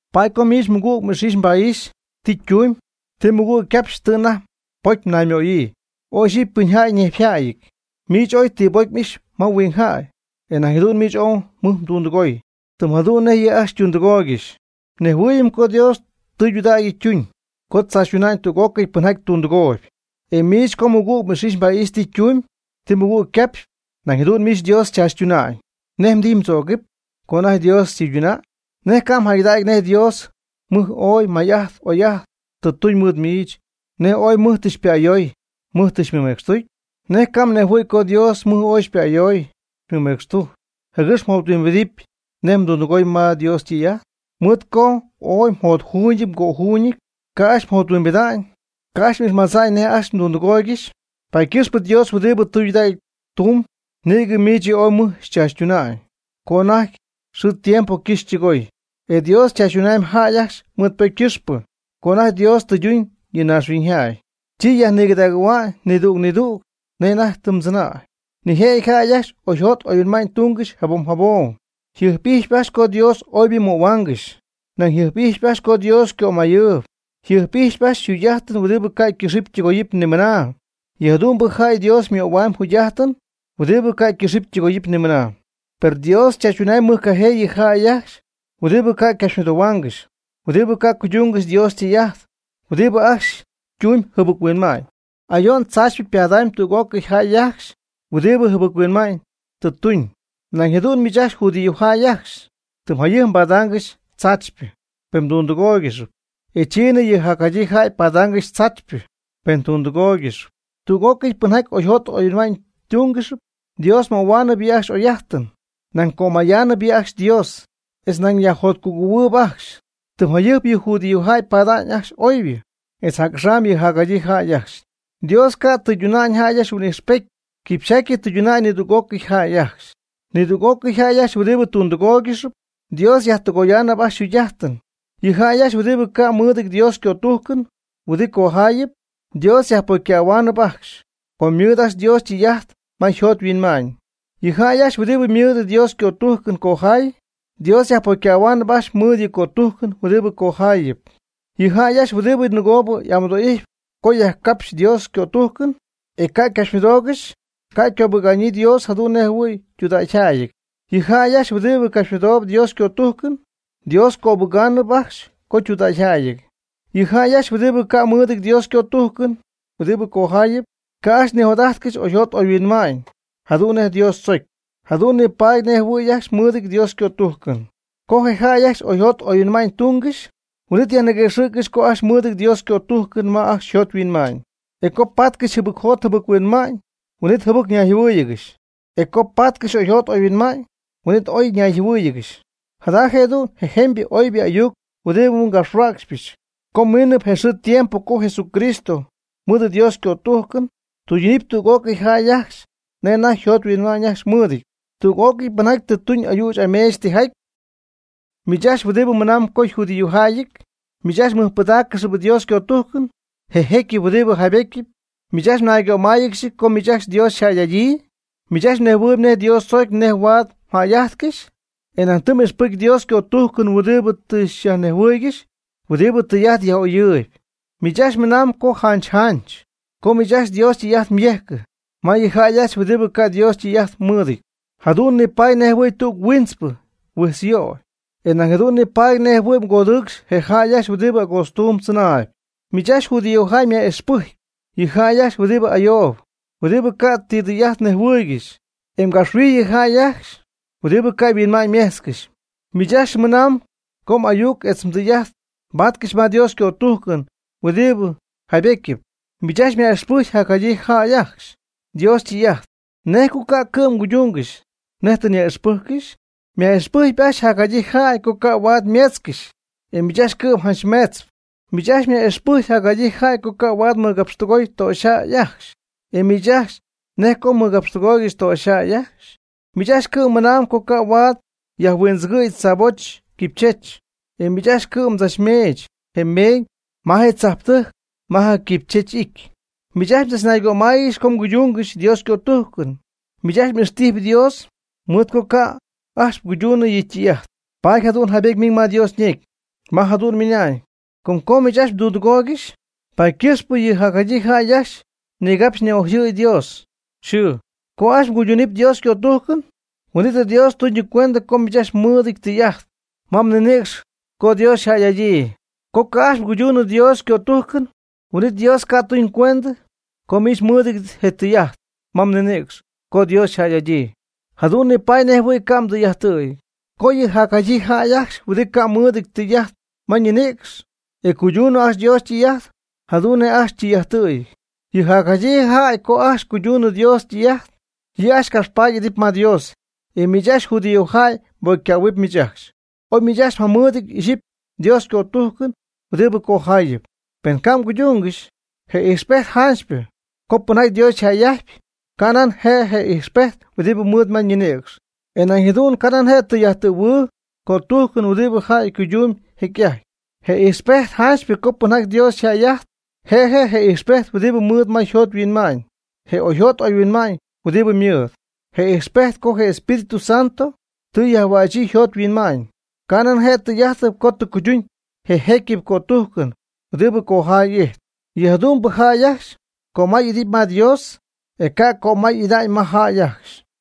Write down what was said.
Paady co miich mɨgüg m'ix'ixy mba'ixy ti ytumyb, ti mɨgüg ycapxyp tɨ anajty pocy mnaymöyii, oy iyxipy ypɨnjäy ñejpyjäyɨty. Miich ooy ti pocy m'ixy ma huing jäy, e nañ jadu'n miich ooy mɨj mdundɨgoy, tɨm jadu'n nej yɨ' ajcxy ytundɨgooygɨxy. Nejhuɨɨyɨm co Dios tudägy ytuñ co tzaachytuñ tüg'ócɨy pɨnjaty tundɨgooyb. E miich co mɨgüg m'ix'ixy mba'ixy ti ytumyb ti mɨgüg ycapxyp, nañ jadu'n miich Dios xychaachytuna'ñ. ¿Nej mdijy mdzögɨp co anajty Dios xytɨyduna'ñ? ¿Nej ca' mjäygɨdägy nej Dios mɨj ooy may'ajt oy'ajt tɨ tuñ mɨɨd miich, nej ooy mɨj tɨ xypa'ayoy, mɨj tɨ xymɨmecxtucy? ¿Nej ca' mnejhuɨ̈y co Dios mɨj ooy xypa'ayoy xymɨmecxtucy, jɨgɨx mjothuimbidɨpy nej mdundɨgoy ma Dios ytɨy'ajt? Mɨɨd co ooy mjotjuuñɨty mgöjuuñɨty, ca' ajcxy mjothuimbida'ñ, ca' ajcxy m'ixmadza'ñ nej ajcxy mdundɨgooygɨxy. Paady ycɨxpɨ Dios huɨdibɨ tudägy tumb nïgɨ miich yɨ' ooy mɨj xychaachytuna'ñ co anajty xɨɨ tiempo ycɨxy ytɨgoy, e Dios chaachytunamyb jäy ajcxy mɨɨd ypocy ycɨxpɨ. Co anajty Dios tɨyduñ yɨ naaxhuiñ jäy, chi yajnigɨdagɨ̈hua'ñ nidüg nidüg nej anajty tɨ chɨnäy. Nijëjɨty jäy ajcxy oyjot oyhuinma'ñ tungɨxy jabom jabom, yjɨjp'ijxpy ajcxy co Dios oybɨ ymöhuaanɨgɨxy, nañ yjɨjp'ijxpy ajcxy co Dios ycömayɨɨyb, yjɨjp'ijxyp ajcxy yjugy'ajtɨn huɨdibɨ ca' ycɨxɨpy ytɨgoyɨpy nimɨna. Yɨ jadu'mbɨ jäy Dios ymöhuamyb jugy'ajtɨn huɨdibɨ ca' ycɨxɨpy ytɨgoyɨpy nimɨna. Per Dios chaachytunamyb mɨjcajee yɨ jäy ajcxy huɨdibɨ ca' ycapxymɨdohuaangɨxy, huɨdibɨ ca' cuydungɨxy Dios ytɨy'ajt, huɨdibɨ ajcxy tumb jɨbɨc-huinma'ñ. Ayo'n tzaachypɨ ypadamyb tüg'ócɨy jäy ajcxy huɨdibɨ jɨbɨc-huinma'ñ tɨ tuñ. Nañ jadu'n miich judíojäy ajcxy tɨm jayɨjp mbadaangɨxy tzaachypɨ, pen mdundɨgooygɨxp, e chiinɨ yɨ jacjadyii jäy padaangɨxy tzaachypɨ, pen tundɨgooygɨxp. Tüg'ócɨy pɨnjaty oyjot oyhuinma'ñ tungɨxp, Dios ymöhuamyb yɨ' ajcxy oy'ajtɨn, nañ cömayaanɨp yɨ' ajcxy Dios, etz nañ yajjotcugɨ̈huɨɨb ajcxy. Tɨm jayɨjp yɨ judíojäy pada'ñ ajcxy oybɨ, etz jac'axam yɨ jacjadyii jäy ajcxy. Dios ca' tɨyduna'ñ jäy ajcxy huin'ijxpety, quipxyjaty tɨyduna'ñ nidüg'ócɨy jäy ajcxy. Nidüg'ócɨy jäy ajcxy huɨdibɨ tundɨgooygɨxp, Dios yajtɨgoyaanɨp ajcxy yjugy'ajtɨn. Yɨ jäy ajcxy huɨdibɨ ca' mɨɨdɨty Dios ycötujcɨn huɨdibɨ cojaayɨp, Dios yajpocycähuaanɨp ajcxy, com ymɨɨd ajcxy Dios ytɨy'ajt ma yjot yhuinma'ñ. Yɨ jäy ajcxy huɨdibɨ mɨɨd Dios ycötujcɨn cojay, Dios yajpocycähuaanɨp ajcxy mɨɨd yɨ' ycötujcɨn huɨdibɨ cojaayɨp. Yɨ jäy ajcxy huɨdibɨ nɨgoob amɨdo'ijtp co yajcapxy Dios ycötujcɨn, e ca' ycapxymɨdoogɨxy, ca' ycöbɨga'ñyii Dios jadu'n nej jɨhuɨ̈y ytudägyjäyɨty. Yɨ jäy ajcxy huɨdibɨ capxymɨdoob Dios ycötújcɨn, Dios cöbɨgaanɨp co ajcxy ytudägyjäyɨty. Yɨ jäy ajcxy huɨdibɨ ca' mɨɨdɨty Dios ycötujcɨn huɨdibɨ cojayɨp, co ajcxy nijot'ajtcɨxy oyjot oyhuinma'ñ jadu'n nej Dios tzocy, jadu'n nipaady nej jɨhuɨ̈y ajcxy mɨɨdɨty Dios ycötujcɨn. Co je jäy ajcxy oyjot oyhuinma'ñ tungɨxy, huin'it yajniguëxɨ̈ccɨxy co ajcxy ymɨɨd Dios ycötujcɨn ma ajcxy yjot yhuinma'ñ. E co paatcɨxy jɨbɨc jot jɨbɨc-huinma'ñ, huin'it jɨbɨc ñayjɨhuɨɨyɨgɨxy. E co patcɨxy oyjot oyhuinma'ñ, huin'it ooy oy ñayjɨhuɨ́ɨyɨgɨxy. Jada je'du'n je jemybɨ oybɨ ayuc huɨdibɨ ngapxhuäcxypɨch co miinɨp je xɨɨ je tiempo co Jesucristo, mɨɨd Dios ycötujcɨn, tɨydunɨp tüg'ócɨy jäy ajcxy nej anajty yjot yhuinma'ñ ajcxy mɨɨdɨty, tüg'ócɨy pɨnjaty tɨ tuñ ayüch ameech tijaty. Miich ajcxy huɨdibɨ mɨnamb co mjudíojäyɨty, miich ajcxy mmɨjpɨdaaccɨxyp Dios ycötujcɨn, je jecyɨp huɨdibɨ jaybetyɨp. Miich ajcxy mnaygömáayɨgɨxy co miich ajcxy Dios xyjäy'adyii. Miich ajcxy mnejhuɨɨyb nej Dios tzocy nej huaad mjäy'ajtcɨxy. E nañ tɨ m'ixpɨcy Dios ycötujcɨn huɨdibɨ tɨ xyajnejhuɨɨygɨxy huɨdibɨ tɨy'ajt jac'oyɨp. Miich ajcxy mɨnamb co janch janch co miich ajcxy Dios ytɨy'ajt myejcɨ ma yɨ jäy ajcxy huɨdibɨ ca' Dios ytɨy'ajt mɨɨdɨty, jadu'n nipaady nej jɨhuɨ̈y tüg huintzpɨ mhuijtzyöy, e nañ jadu'n nipaady nej jɨhuɨ̈y mgodɨcxy je jäy ajcxy huɨdibɨ agootztuum tzɨnaayb. Miich ajcxy judíojäy myaj'ixpɨjcpy yɨ jäy ajcxy huɨdibɨ ayoob, huɨdibɨ ca' ti tɨy'ajt nejhuɨɨygɨxy, e mgapxhuijy yɨ jäy ajcxy huɨdibɨ ca' yhuinma'ñymejtzcɨxy. Miich ajcxy mɨnamb co m'ayuc etz mdɨy'ajt mbaatcɨxy ma Dios ycötujcɨn huɨdibɨ jaybetyɨp. Miich ajcxy myaj'ixpɨjcpy jacjadyii jäy ajcxy Dios ytɨy'ajt. ¿Nej co ca' cɨ'm mguydungɨxy nej tɨ myaj'ixpɨjccɨxy? Myaj'ixpɨjcpy ajcxy jacjadyii jäy co ca' huaad ymeetzcɨxy, e miich cɨ'm ajcxy meetzp. Miich ajcxy myaj'ixpɨjcpy jacjadyii jäy co ca' huaad mɨgapxtɨgoy töxyjäy ajcxy, e ¿miich ajcxy nej co mmɨgapxtɨgooygɨxy töxyjäy ajcxy? Miich ajcxy cɨ'm mɨnamb co ca' huaad yajhuindzɨgɨ̈y tzaaboch quipychech, e miich ajcxy cɨ'm mdzachmeech je meeñ ma je tzajptɨjc ma je quipychech y'ity. Miich ajcxy mdzachnaygömáayɨgɨxy co mguydungɨxy Dios ycötujcɨn. Miich ajcxy m'ixtijy Dios mɨɨd co ca' ajcxy mguydunɨ yɨ' ytɨy'ajt. Paady jadu'n jaybety miiñ ma Dios ñecy, ma jadu'n ymɨna'ñ: “Com co miich ajcxy mdundɨgooygɨxy, paady ycɨxpɨ yɨ jacjadyii jäy ajcxy nigapxy ni'ojɨ̈y Dios yxɨɨ.” Co ajcxy mguyduunɨp Dios ycötujcɨn, huin'it Dios xytunɨpcuendɨ co miich ajcxy mɨɨdɨty je tɨy'ajt ma mninïcx co Dios xyjäy'adyii. Co ca' ajcxy mguyduunɨp Dios ycötujcɨn, huin'it Dios ca' xytunɨpcuendɨ co miich mɨɨdɨty je tɨy'ajt ma mninïcx co Dios xyjäy'adyii. Jadu'n nipaady nej jɨhuɨ̈y ca' mdɨy'ajttɨ̈yɨty. Co yɨ jacjadyii jäy ajcxy huɨdibɨ ca' mɨɨdɨty tɨy'ajt ma ñinïcx, e cuydunɨ ajcxy Dios ytɨy'ajt, jadu'n nej ajcxy ytɨy'ajttɨ̈yɨty. Yɨ jacjadyii jäy co ajcxy cuyduñ Dios ytɨy'ajt, yɨ' ajcxy capxpaady'idɨpy ma Dios. E miich ajcxy judíojäy mbocycähuɨp miich ajcxy, oy miich ajcxy mjamɨɨdɨty ixyipy Dios ycötújcɨn huɨdi cojaayɨp, pen ca' mguydungɨxy. Je ijxpejt janchypɨ co pɨnjaty Dios yjäy'ajtyp, canan je' je ijxpejt huɨdibɨ ymɨɨd ma ninïcx. E nañ jadu'n canan je' je tɨy'ajttɨ̈huɨɨ cötujcɨn huɨdibɨ jäy cuydun jecy'ajty. Je ijxpejt janchypɨ co pɨnjaty Dios yjäy'ajtyp, je' je' je ijxpejt huɨdibɨ ymɨɨd ma yjot yhuinma'ñ, je oyjot oyhuinma'ñ huɨdibɨ ymɨɨd, je ijxpejt co je Espíritu Santo tɨ yajhuächyii yjot yhuinma'ñ, canan je' je tɨy'ajt co tɨ cuyduñ je jecyɨp cötujcɨn huɨdibɨ cojay ijtp. Yɨ jadu'mbɨ jäy ajcxy cömay'idɨpy ma Dios, e ca' ycömay'ida'ñ ma jäy ajcxy.